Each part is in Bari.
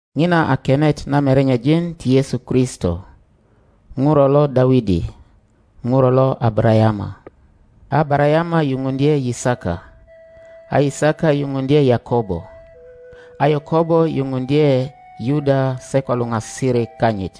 Ŋina a kenet na merenyejin ti Yesu Kristo, ŋuro lo Dawidi, ŋuro lo Abarayama. A Abarayama yuŋuŋdye Yisaka, a Yisaka yuŋuŋdye Yakobo, a Yakobo yuŋuŋdye Yuda se ko luŋasirik kanyit,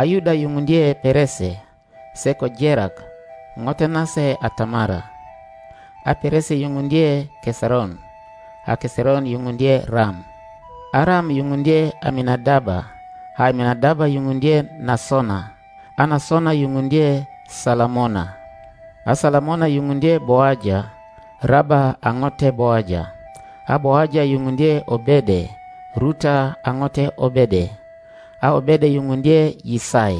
a Yuda yuŋuŋdye Perese, se ko Jerak (ŋote nase a Tamara), a Perese yuŋuŋdye Keseron, a Keseron yuŋuŋdye Ram, a Ram yuŋuŋdye Aminadaba, a Aminadaba yuŋuŋdye Nasona, a Nasona yuŋuŋdye Salamona, a Salamona yuŋuŋdye Boaja (Raba a ŋote Boaja), a Boaja yuŋuŋdye Obede (Ruta a ŋote Obede), a Obede yuŋuŋdye Yisai,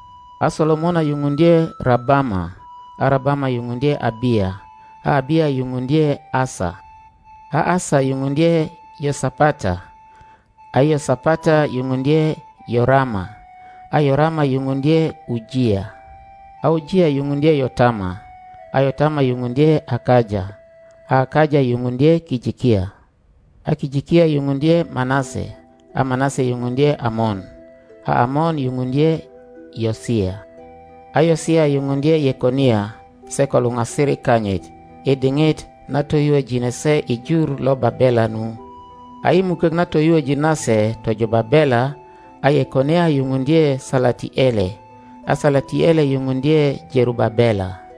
a Solomona yuŋuŋdye Rabama, a Rabama yuŋuŋdye Abiya, a Abiya yuŋuŋdye Asa, a Asa yuŋuŋdye Yosapata, a Yosapata yuŋuŋdye Yorama, a Yorama yuŋuŋdye Ujiya, a Ujiya yuŋuŋdye Yotama, a Yotama yuŋuŋdye Akaja, a Akaja yuŋuŋdye Kijikiya, a Kijikiya yuŋuŋdye Manase, a Manase yuŋuŋdye Amon, a Amon yuŋuŋdye Yosia, a Yosia yuŋuŋdye Yekonia se ko luŋasirik kanyit, i diŋit na toyuojine se i jur lo Babela nu. A i mukok na toyuoji nase tojo Babela, a Yekonia yuŋuŋdye Salatiele, a Salatiele yuŋuŋdye Jerubabela,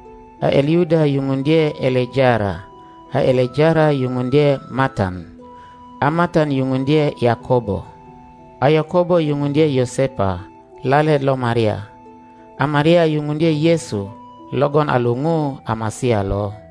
a Eliyuda yuŋuŋdye Elejara, a Elejara yuŋuŋdye Matan, a Matan yuŋuŋdye Yakobo, a Yakobo yuŋuŋdye Yosepa lalet lo Maria, a Maria yuŋuŋdye Yesu logon a luŋu a Masia lo.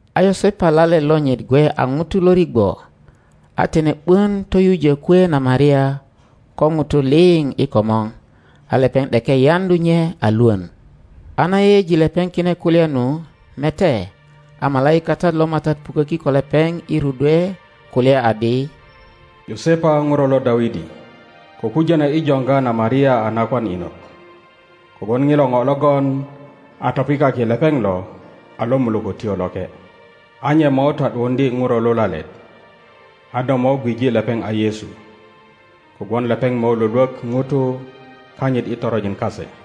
A Yosepa lalet lonyit gwe a ŋuto lo rigwo, a tine ’bon toyujo kwe na Maria ko ŋutu liŋ i komor, a lepeŋ ’deke yaŋdu nye a Iwon. a na yeyeji lepeŋ kine kulya nu, mete, a malaikatat lo MATAT puköki ko lepeŋ i rudwe kulya adi, Yosepa ŋuro lo Dawidi, ko kujono i joŋga na Maria a nakwan inot, kogwon ŋilo ŋo logon a topikaki lepeŋ lo a lo Mulökötyo Loke. A nye mo ta ’duuŋdye ŋuro lulalet, a do mo gwije lepeŋ a Yesu, kogwon lepeŋ mo Iwolwok ŋutu kanyit i toronjin kase.